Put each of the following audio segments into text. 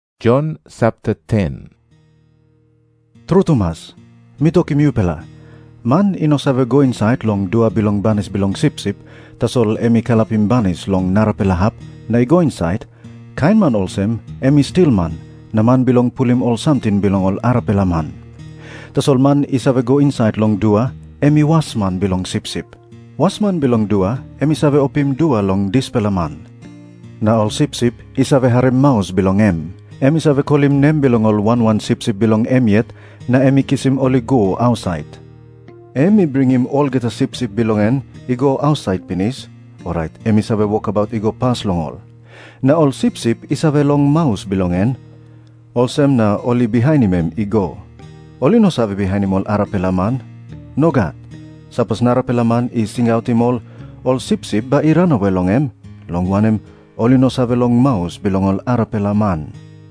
Jisas i tok moa olsem, "Tru tumas mi tokim yupela, man i no save go insait long dua bilong banis bilong sipsip, tasol em i kalapim banis long narapela hap na i go insait, kain man olsem em i stilman na man bilong pulim ol samting bilong ol arapela man. Tasol man i save go insait long dua, em i wasman bilong sipsip. Wasman bilong dua em i save opim dua long dispela man. Na ol sipsip ol i save harim maus bilong em. Em i save kolim nem bilong ol wan wan sipsip bilong em yet, na em i kisim ol i go ausait. Em i bringim olgeta sipsip bilong en i go ausait pinis, orait em i save wokabaut i go pas long ol. Na ol sipsip i save long maus bilong en, olsem na ol i bihainim em i go. Ol i no save bihainim ol arapela man. Nogat. Sapos narapela man i singautim ol, ol sipsip bai i ranawe long em, long wanem, ol i no save long maus bilong ol arapela man."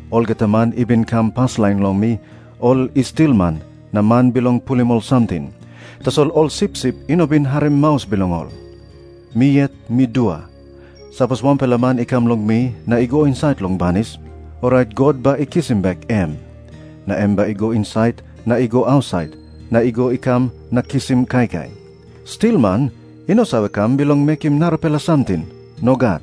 Olgeta man i bin kam paslain long mi, ol i stilman na man bilong pulim ol samting. Tasol ol sipsip i no bin harim maus bilong ol. Mi yet mi dua. Sapos wanpela man i kam long mi na i go insait long banis, orait God bai i kisim bek em. Na em bai i go insait na i go ausait, na i go i kam na kisim kaikai. "Stilman i no save kam bilong mekim narapela samting. Nogat.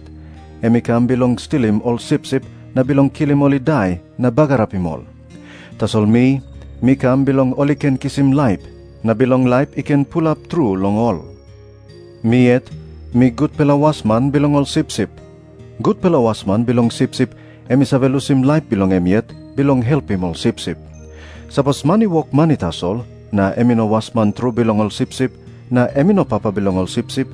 Em i kam bilong stilim ol sipsip na bilong kilim ol i dai na bagarapim ol. Tasol mi, mi kam bilong ol i ken kisim laip, na bilong laip i ken pulap tru long ol. Mi yet mi gutpela wasman bilong ol sipsip. Gutpela wasman bilong sipsip em i save lusim laip bilong em yet bilong helpim ol sipsip. Sapos man i wok mani tasol, na em i no wasman tru bilong ol sipsip, na em i no papa bilong ol sipsip,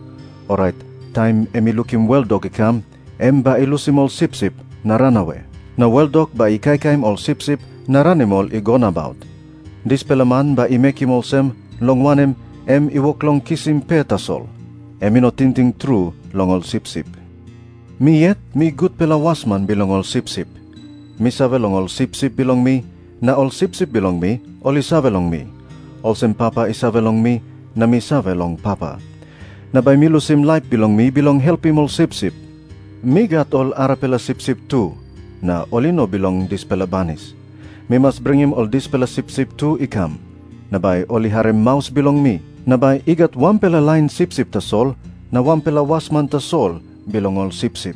orait taim em i lukim weldok i kam, em bai i lusim ol sipsip na ranawe. Na weldok bai i kaikaim ol sipsip na ranim ol i go nabaut. Dispela man bai i mekim olsem, long wanem, em i wok long kisim pe tasol. Em i no tingting tru long ol sipsip. "Mi yet mi gutpela wasman bilong ol sipsip. Mi save long ol sipsip bilong mi, na ol sipsip bilong mi ol i save long mi, olsem Papa i save long mi, na mi save long Papa. Na bai mi lusim laip bilong mi bilong helpim ol sipsip. Mi gat ol arapela sipsip tu, na ol i no bilong dispela banis. Mi mas bringim ol dispela sipsip tu i kam. Na bai ol i harim maus bilong mi. Na bai i gat wanpela lain sipsip tasol na wanpela wasman tasol bilong ol sipsip.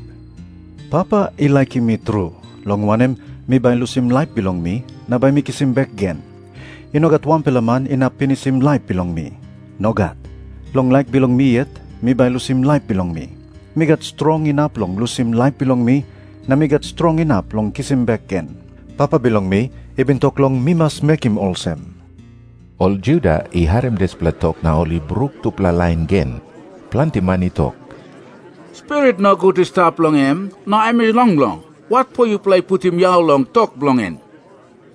Papa i laikim mi tru, long wanem, mi bai lusim laip bilong mi na bai mi kisim bek gen. I no gat wanpela man inap pinisim laip bilong mi. Nogat. Long laik bilong mi yet mi bai lusim laip bilong mi. Mi gat strong inap long lusim laip bilong mi, na mi gat strong inap long kisim bek gen. Papa bilong mi i bin tok long mi mas mekim olsem." Ol Juda i harim dispela tok na ol i bruk tupela lain gen. Planti man i tok, "Spirit nogut i stap long em, na em i longlong. Watpo yupela i putim yau long tok bilong en?"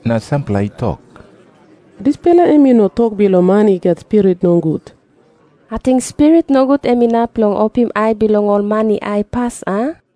Na sampela i tok, "Dispela em i no tok bilong man i gat spirit nogut. Ating spirit nogut em inap long opim ai bilong ol man i aipas, a?"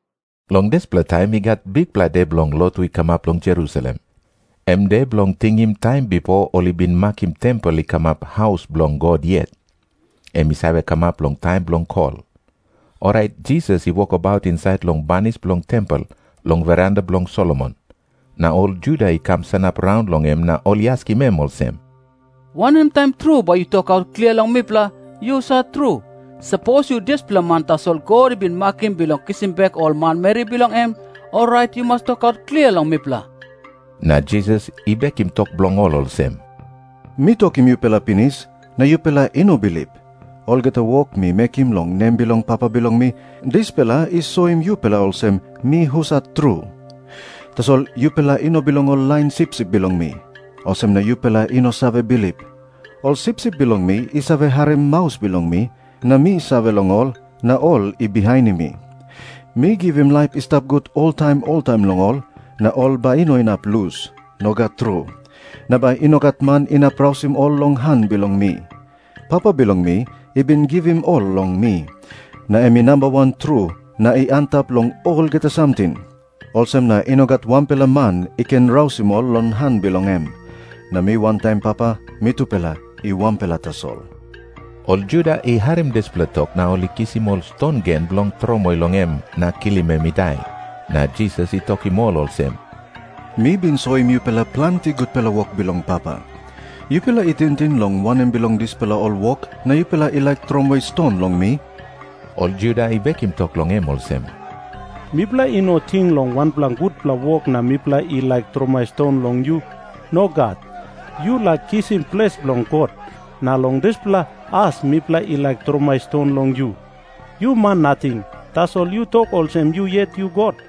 Long dispela taim i gat bikpela de bilong lotu i kamap long Jerusalem. Em de bilong tingim taim bipo ol i bin makim tempel i kamap haus bilong God yet. Em i save kamap long taim bilong kol. Orait Jisas i wokabaut insait long banis bilong tempel, long veranda bilong Solomon. Na ol Juda i kam sanap raun long em na ol i askim em olsem, "Wanem taim tru bai yu tokaut klia long mipela, yu husat tru? Sapos yu dispela man tasol God i bin makim bilong kisim bek ol manmeri bilong en, orait yu mas tokaut klia long mipela." Na Jisas i bekim tok bilong ol olsem, "Mi tokim yupela pinis, na yupela i no bilip. Olgeta wok mi mekim long nem bilong Papa bilong mi, dispela i soim yupela olsem mi husat tru. Tasol yupela i no bilong ol lain sipsip bilong mi. Olsem na yupela i no save bilip. Ol sipsip bilong mi i save harim maus bilong mi, na mi save long ol, na ol i bihainim mi. Mi givim laip i stap gut oltaim oltaim long ol, na ol bai i no inap lus. Nogat tru. Na bai i no gat man inap rausim ol long han bilong mi. Papa bilong mi i bin givim ol long mi. Na em i namba wan tru na i antap long olgeta samting. Olsem na i no gat wanpela man i ken rausim ol long han bilong em. Na mi wantaim Papa mitupela i wanpela tasol." Ol Juda i harim dispela tok na ol i kisim ol ston gen bilong tromoi long em na kilim em i dai. Na Jisas i tokim ol olsem, "Mi bin soim yupela planti gutpela wok bilong Papa. Yupela i tingting long wanem bilong dispela ol wok na yupela i laik tromoi ston long mi?" Ol Juda i bekim tok long em olsem, "Mipela i no ting long wanpela gutpela wok na mipela i laik tromoi ston long yu. Nogat. Yu laik kisim ples bilong God, na long dispela as mipela i laik tromoi ston long yu. Yu man nating, tasol yu tok olsem yu yet yu God."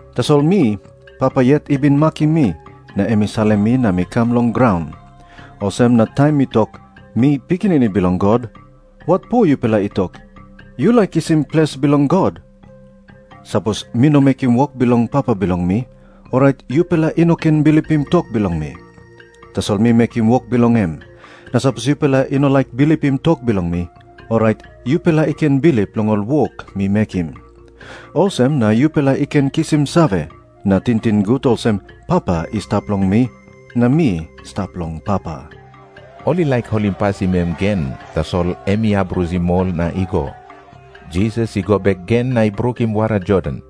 Tasol mi, Papa yet i bin makim mi, na em i salim mi na mi kam long graun. Olsem na taim mi tok, 'Mi Pikinini Bilong God,' watpo yupela i tok, 'Yu laik kisim ples bilong God'? "Sapos mi no mekim wok bilong Papa bilong mi, orait yupela i no ken bilipim tok bilong mi. Tasol mi mekim wok bilong em. Na sapos yupela i no laik bilipim tok bilong mi, orait yupela i ken bilip long ol wok mi mekim. Olsem na yupela i ken kisim save na tingting gut olsem, Papa i stap long mi, na mi stap long Papa." Ol i laik holimpasim em gen, tasol em i abrusim ol na i go. Jisas i go bek gen na i brukim wara Jordan.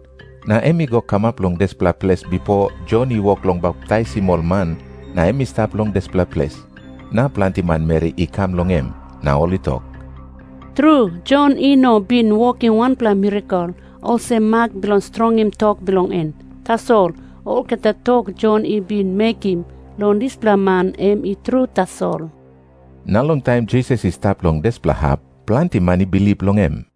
Na em i go kamap long dispela ples bipo Jon i wok long baptaisim ol man, na em i stap long dispela ples. Na planti manmeri i kam long em. Na ol i tok, "Tru, Jon i no bin wokim wanpela mirakel olsem mak bilong strongim tok bilong en. Tasol olgeta tok Jon i bin mekim long dispela man em i tru tasol." Na long taim Jisas i stap long dispela hap, planti man i bilip long em.